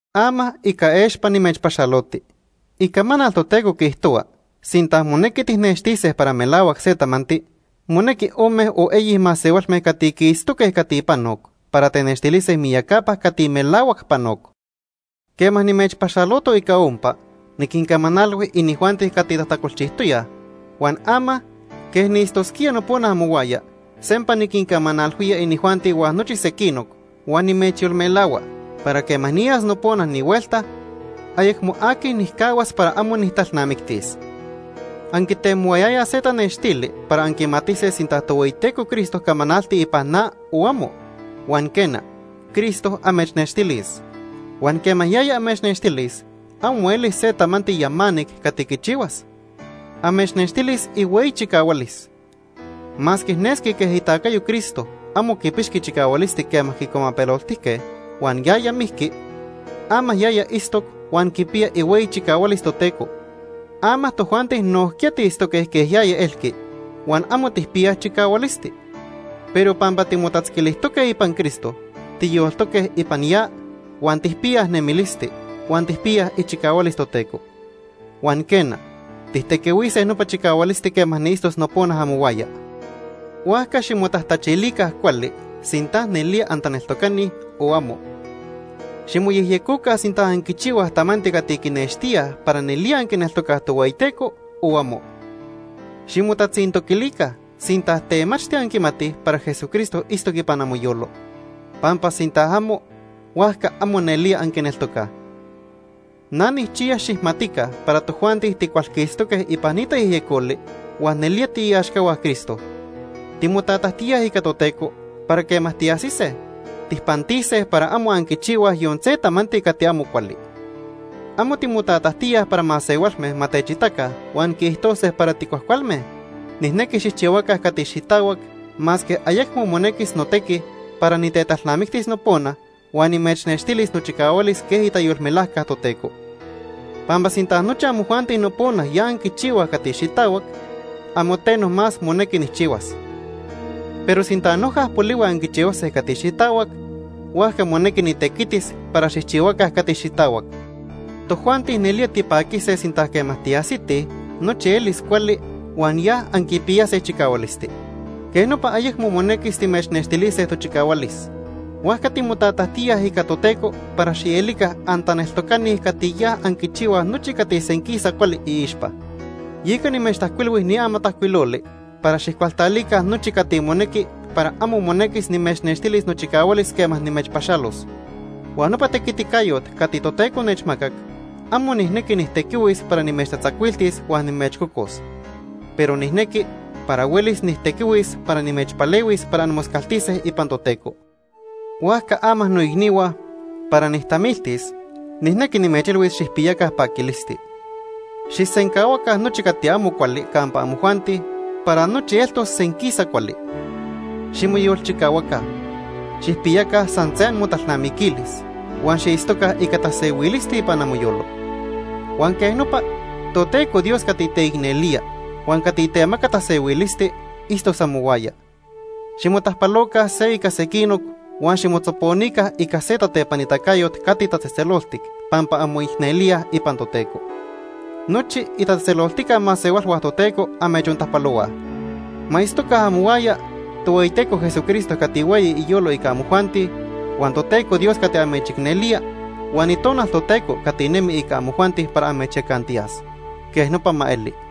Ama ica expa nimechpaxaloti. Icamanal Toteco quiijtohua sinta monequi tijnextise para melahuac se tamanti, monequi ome o eyi masehualme cati quiitztoque cati panoc para tenextilise miyacapa cati melahuac panoc. Quema nimechpaxaloto ica ompa, niquincamanalhui inijuanti cati tajtacolchijtoyaj, huan ama, quej niitztosquía nopona amohuaya, sempa niquincamanalhuía inijuanti huan nochi sequinoc, huan nimechyolmelahua para quema niyas nopona ni huelta, ayecmo aqui nijcahuas para amo nijtalnamictis. Anquitemohuayayaj se tanextili para anquimatise sinta Tohueyiteco Cristo camanalti ipan na o amo, huan quena, Cristo amechnextilis. Huan quema yaya amechnextilis amo elis se tamanti yamanic cati quichihuas, amechnextilis ihueyi chicahualis. Masque nesqui quej itacayo Cristo amo quipixqui chicahualisti quema quicuamapeloltijque huan yaya mijqui, ama yaya itztoc huan quipiya ihueyi chicahualis Toteco. Ama tojuanti nojquiya tiitztoque quej yaya elqui huan amo tijpiyaj chicahualisti. Pero pampa timotatzquilijtoque ipan Cristo, tiyoltoque ipan ya, huan tijpiyaj nemilisti, huan tijpiyaj ichicahualis Toteco. Huan quena, tijtequihuise nopa chicahualisti quema niitztos nopona amohuaya. Huajca ximotajtachilica cuali sinta nelía antaneltocani o amo. Ximoyejyecoca sinta anquichihuaj tamanti cati quinextíaj para nelía anquineltocaj Tohueyiteco o amo. Ximotatzintoquilica sinta temachti anquimatij para Jesucristo itztoc ipan amoyolo. Pampa sinta amo, huajca amo nelía anquineltocaj. Na nijchiya xijmatica para tojuanti ticualquistoque ipan ni tayejyecoli huan nelía tiiaxcahua Cristo. Timotatajtíaj ica Toteco para quema tiajsise, tijpantise para amo anquichihuaj yon se tamanti cati amo cuali. Amo timotatajtíaj para masehualme ma techitaca huan quiijtose para ticuajcualme. Nijnequi xijchihuaca cati xitahuac masque ayecmo monequis notequi para nitetalnamictis nopona huan nimechnextilis nochicahualis quej itayolmelajca Toteco. Pampa sinta nochi amojuanti nopona ya anquichihuaj cati xitahuac, amo teno más monequi nijchihuas. Pero sinta noja polihui anquichihuase cati xitahuac, huajca monequi nitequitis para xijchihuaca cati xitahuac. Tojuanti nelía tipaquise sinta quema tiajsitij, nochi elis cuali huan ya anquipiyase chicahualisti. Quej nopa ayecmo monequis timechnextilise tochicahualis. Huajca timotatajtíaj ica Toteco para xielica antaneltocani cati ya anquichihuaj nochi cati senquisa cuali iixpa. Yeca nimechtajcuilhui ni amatajcuiloli para xijcualtalica nochi cati monequi para amo monequis nimechnextilis nochicahualis quema nimechpaxalos. Huan nopa tequiticayot cati Toteco nechmacac, amo nijnequi nijtequihuis para nimechtatzacuiltis huan nimechcocos, pero nijnequi para huelis nijtequihuis para nimechpalehuis para anmoscaltise ipan Toteco. Huajca ama, noicnihua, para nijtamiltis nijnequi nimechilhuis, xijpiyaca paquilisti. Xijsencahuaca nochi cati amo cuali campa amojuanti para nochi eltos senquisa cuali. Ximoyolchicahuaca. Xijpiyaca san se amotalnamiquilis huan xiitztoca ica tasehuilisti ipan amoyolo. Huan quej nopa, Toteco Dios cati teicnelía huan cati temaca tasehuilisti itztos amohuaya. Ximotajpaloca se ica sequinoc huan ximotzoponica ica se tatepanitacayot cati tatzejtzeloltic pampa anmoicnelíaj ipan Toteco. Nochi itatzejtzeloltica masehualhua Toteco amechontajpalohuaj. Ma itztoca amohuaya Tohueyiteco Jesucristo cati hueyi iyolo ica amojuanti, huan Toteco Dios cati amechicnelía, huan Itonal Toteco cati nemi ica amojuanti para amechyacantiyas. Quej nopa ma eli.